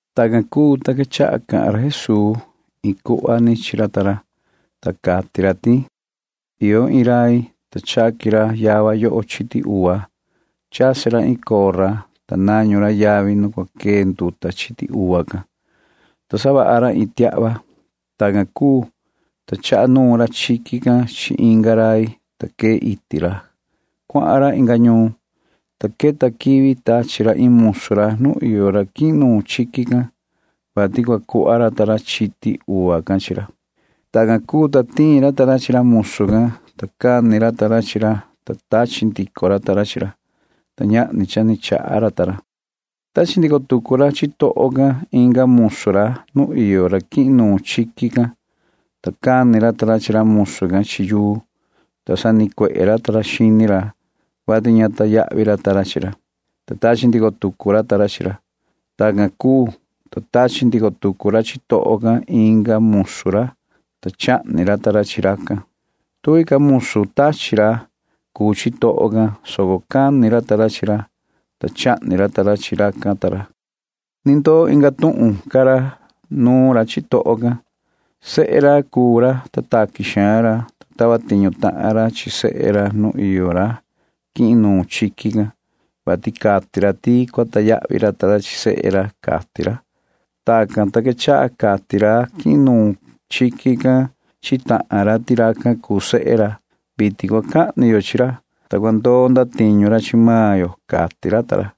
Tacan cuu, ta quechaha cahan ra Jesuu iin cuhva chi ra ta ra, ta cati ra ti: ―Cha iyo iin rai, ta chaqui ra yava yoho chiti uva. Chasi ra iin cora, ta nañu ra yavi nu cua quee nduta chiti uva can, ta savaha ra iin tiahva. Tacan cuu, ta chaha nuun ra chiqui can chi inga rai, ta quee iti ra. Cuahan ra inga ñuun, ta queta quivi tachi ra iin musu ra nu iyo ra quihin nuun chiqui can, vati cua cuhva ra ta ra chiti uva can chi ra. Tacan cuu, ta tiin ra ta ra chi ra musu can, ta cani ra ta ra chi ra, ta tachi ndico ra ta ra chi ra, ta ñahni cha ni chaha ra ta ra. Tachi ndico tucu ra chitoho can inga musu ra nu iyo ra quihin nuun chiqui can, ta cani ra ta ra chi ra musu can chi yuu, ta sanicuehe ra ta ra xini ra, vati ña sacahnu ra ta ra chi ra, ta tachi ndico ra ta ra chi ra. Tacan cuu, ta tachi ndico tucu ra chitoho can inga musu ra, ta chahni ra ta ra chi racan. Cuaha ca musu tachi ra cuu chitoho can, soco cani ra ta ra chi ra, ta chahni ra ta ra chi ra. ’Ni ndoo inga tuhun ca ra nuun ra chitoho can. Sehe taqui xaan ra chi ra, ta tava tiñu tahan ra chi sehe ra nu iyo ra quihin nuun chiqui can, vati cati ra ti cua sacahnu ra ta ra chi sehe ra, cati ra. Tacan, ta quechaha cati ra quihin nuun chiqui can chi tahan ra ti racan cuu sehe ra. Vitin cua cahni ra chi ra, ta cua ndoo ndatiñu ra chi maan ra, cati ra ta ra.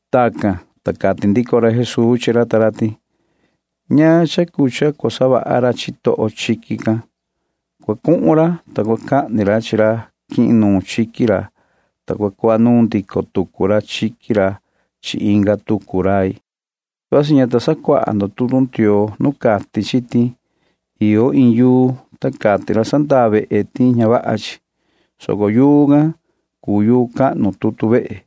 Tacan, ta cati ndico ra Jesuu chi ra ta ra ti: ―¿Ñaan cha cuu cha cua savaha ra chitoho chiqui can? Cua cuhun ra, ta cua cahni ra chi ra quihin nuun chiqui ra, ta cua cuhva nuun ndico tucu ra chiqui ra chi inga tucu rai. ’Vasi ña ta sacuaha ndo tutu Ndioo nu cati chi ti: Iyo iin yuu, ta cati ra sandaa vehe ti ña vaha chi, soco yuu can cha cuu yuu cahnu tutu vehe.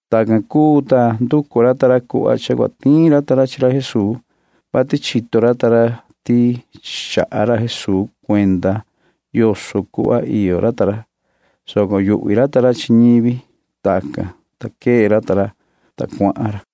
Tacan cuu, ta nducu ra ta ra cuhva cha cua tiin ra ta ra chi ra Jesuu, vati chito ra ta ra ti chaha ra Jesuu cuenda yoso cuhva iyo ra ta ra, soco yuhvi ra ta ra chi ñivi. Tacan, ta quee ra ta ra, ta cuahan ra.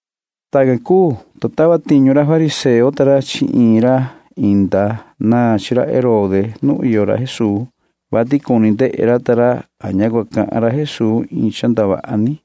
Tacan cuu, ta tava tiñu ra ta ra chi ra fariseo chi ra inda naan chi ra Herode nu iyo ra Jesuu, vati cuni ndehe ra ta ra a ña cua cahan ra Jesuu iin cha ndavaha ni.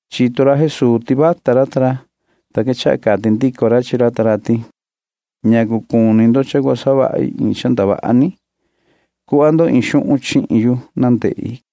Chito ra Jesuu ti vata ra ta ra, ta quechaha cati ndico ra chi ra ta ra ti: ―¿Ñacu cuni ndo cha cua savahi iin cha ndavaha ni? Cuhva ndo iin xuhun chihin yu na ndehi ―cati ra.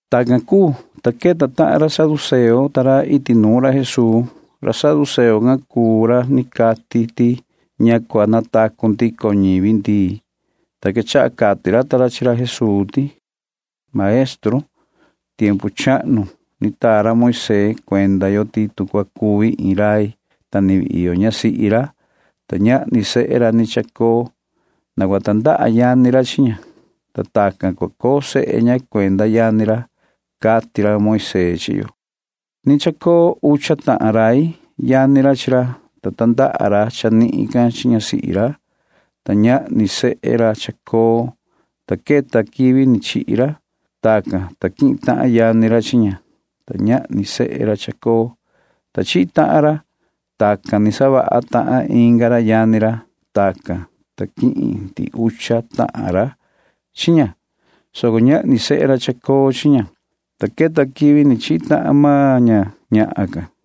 Tacan cuu, ta queta tahan ra saduceo ta ra iti nuun ra Jesuu. Ra saduceo can cuu ra cati ti ña cua natacu ndico ñivi ndii, ta quechaha cati ra ta ra chi ra Jesuu ti: ―Maestru, tiempu chahnu ni taa ra Moisee cuenda yo ti tu cua cuvi iin rai, ta ni vii iyo ñasihi ra, ta ñahni sehe ra ni chacoo, na cua tandaha yani ra chi ña, ta tacan cua coo sehe ña cuenda yani ra, cati ra Moisee chi yo. Ni chacoo ucha tahan rai. Yani ra chi ra, ta tandaha ra chanihin can chi ñasihi ra, ta ñahni sehe ra chacoo, ta queta quivi ni chihi ra. Tacan, ta quihin tahan yani ra chi ña, ta ñahni sehe ra chacoo, ta chihi tahan ra. Tacan ni savaha tahan inga ra yani ra. Tacan, ta quihin ndihi ucha tahan ra chi ña, soco ñahni sehe ra chacoo chi ña, ta queta quivi ni chihi tahan maan ña ñahan can.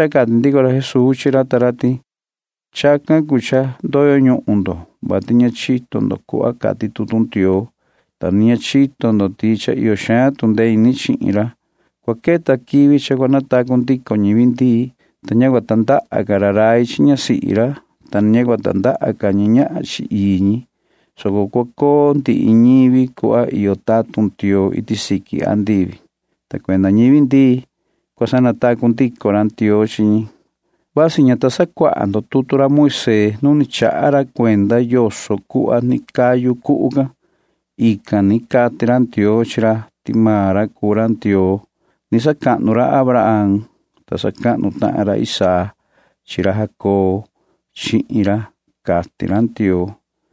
Ta quechaha cati ndico ra Jesuu chi ra ta ra ti: ―Chacan cuu cha ndoyo ñuhun ndo, vati ña chito ndo cuhva cati tutu Ndioo, ta ni ña chito ndo ti cha iyo xaan tu ndee ini chi ra. Cua queta quivi cha cua natacu ndico ñivi ndii, ta ña cua tandaha ca ra rai chi ñasihi ra, ta ni ña cua tandaha ca ñi ñahan chi ii ñi, soco cua coo ndihi ñivi cuhva iyo tatun Ndioo iti siqui andivi, ta cuenda ñivi ndii―cua sanatacu ndico ra Ndioo chi ñi. Vasi ña ta sacuaha ndo tutu Moisee nu ni chaha ra cuenda yoso cuhva ni cayu cuhu can. Ican ni cati ra Ndioo chi ra ti maan ra cuu ra Ndioo. Sacahnu ra Abraham chihin ra, ta sacahnu tahan ra Isaac chi ra Jacobo chihin ra, cati ra Ndioo.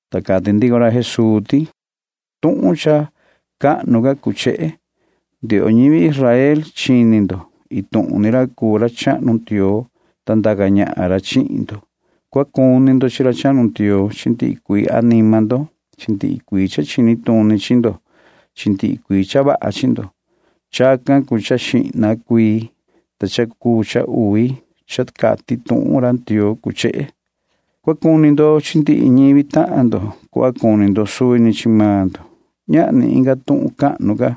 Ta cati ndico ra Jesuu ti: ―Tuhun cha cahnu ca cuu chehe: “Ndioho ñivi Israel, chini ndo. Iin tuhun ni ra cuu ra chahnu Ndioo, ta ndaca ñahan ra chihin ndo. Cua cuni ndo chi ra chahnu Ndioo chi ndihi cuii anima ndo chi ndihi cuii cha chini tuni chi ndo chi ndihi cuii cha vaha chi ndo.” Chacan cuu cha xihna cuii, ta cha cuu uvi can cha cati tuhun ra Ndioo cuu chehe: “Cua cuni ndo chi ndihi ñivi tahan ndo cuhva cuni ndo suvi ni chi maan ndo.” Ñahni inga tuhun cahnu ca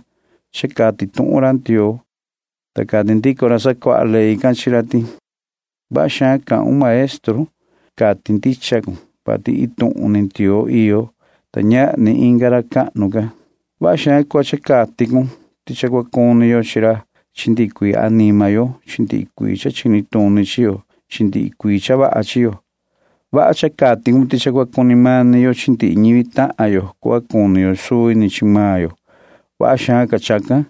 cha cati tuhun ra Ndioo ―cati ra Jesuu. Ta cati ndico ra sacuaha ley can chi ra ti: ―Vaha xaan cahun, maestru. Cati ndicha cun, vati iin tuhun ni Ndioo iyo, ta ñahni inga ra cahnu ca. Vaha xaan cuhva cha cati cun ti cha cua cuni yo chi ra chi ndihi cuii anima yo chi ndihi cuii cha chini tuni chi yo chi ndihi cuii cha vaha chi yo. Vaha cha cati cun ti cha cua cuni mani yo chi ndihi ñivi tahan yo cuhva cuni yo suvi ni chi maan yo. Vaha xaan ca chacan,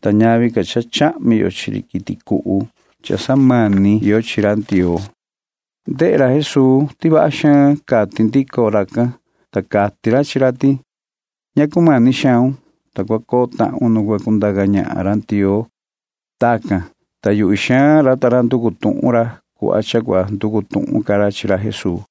ta ñavi ca cha chahmi yo chi ri quiti cuhu cha samani yo chi ra Ndioo ―cati ra. Ndehe ra Jesuu ti vaha xaan cati ndico racan, ta cati ra chi ra ti: ―Ña cumani xaun, ta cua coo tahun nu cua cundaca ñahan ra Ndioo ―cati ra. Tacan, ta yuhvi xaan ra ta ra nducu ra cuhva cha cua nducu tuhun ca ra chi ra Jesuu.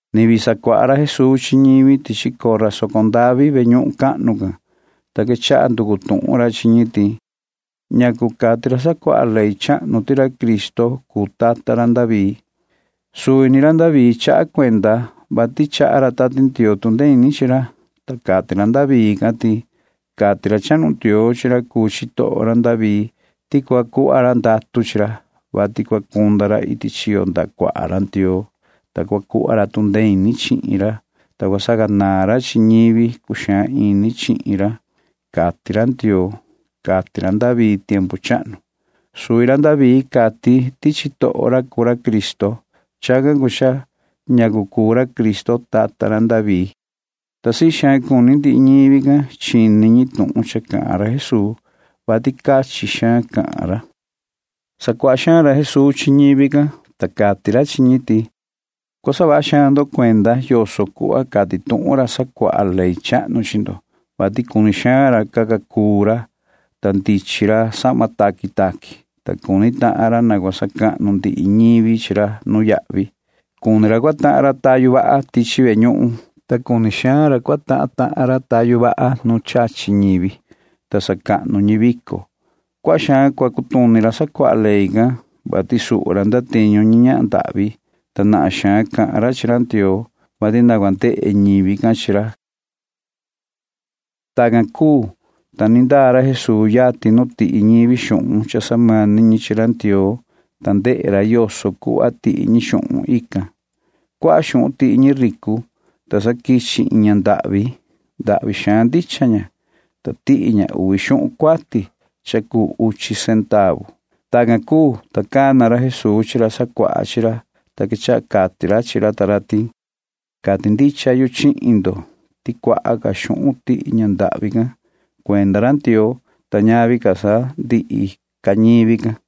Ni vii sacuaha ra Jesuu chi ñivi tichi cora soco ndavi [ve ñuhun cahnu can], ta quechaha nducu tuhun ra chi ñi ti: ―¿Ñacu cati ra sacuaha ley chahnu ti ra Cristo cuu tata ra David nu cuahan quivi? Suvi ra David chaha cuenda, vati chaha ra Tati Ndioo tu ndee ini chi ra, ta cati ra David can ti: Cati ra chahnu Ndioo chi ra cuu chitoho ra David ti [cua cuhva ra ndatu chi ra], vati cua cunda ra iti chiyo ndaha cuaha ra Ndioo, [ta cua cuhva ra tu ndee ini chihin ra,] ta cua sacanaan ra chi ndihi ñivi cuxaan ini chihin ra, cati ra Ndioo, cati ra David tiempu chahnu. Suvi ra David cati ti chitoho ra cuu ra Cristo. Chacan cuu cha ñacu cuu ra Cristo tata ra David nu cuahan quivi iti nuun ―cati ra Jesuu. Ta sii xaan cuni ndihi ñivi can chini ñi tuhun cha cahan ra Jesuu, [vati cachin xaan cahan ra]. Sacuaha xaan ra Jesuu chi ñivi can, ta cati ra chi ñi ti: ―Cua saha vaha xaan ndo cuenda yoso cuhva cati tuhun ra sacuaha ley chahnu chi ndo, vati cuni xaan ra caca cuu ra, ta ndichin ra sahma taqui taqui, ta cuni tahan ra na cua sacahnu ndihi ñivi chi ra nuyahvi. Cuni ra cua tahan ra tayu vaha tichi ve ñuhun, ta cuni xaan ra cua tahan tahan ra tayu vaha nu chachi ñivi, ta sacahnu ñi vico. Cuaha xaan cua cutuni ra sacuaha ley can, vati suhu ra ndatiñu ñi ñahan ndahvi, ta nahan xaan cahan ra chi ra Ndioo, vati na ndehe ñivi can chi ra ―cati ra Jesuu. Tacan cuu, ta ni ndaa ra Jesuu yatin nu tihi ñivi xuhun cha samani ñi chi ra Ndioo, ta ndehe ra yoso cuhva tihi ñi xuhun ican. Cuaha xuhun tihi ñi ricu, ta sa quichi iin ña ndahvi. Ndahvi xaan ndicha iyo ña, ta tihi ña uvi xuhun cuati cha cuu uchi centavu. Tacan cuu, ta cana ra Jesuu chi ra sacuaha chi ra, ta quechaha cati ra chi ra ta ra ti: ―Cati ndicha yu chihin ndo ti cha tihi ña ndahvi can cuaha ca xuhun [cuenda ra Ndioo], ta ñavi ca sa ndihi ca ñivi can.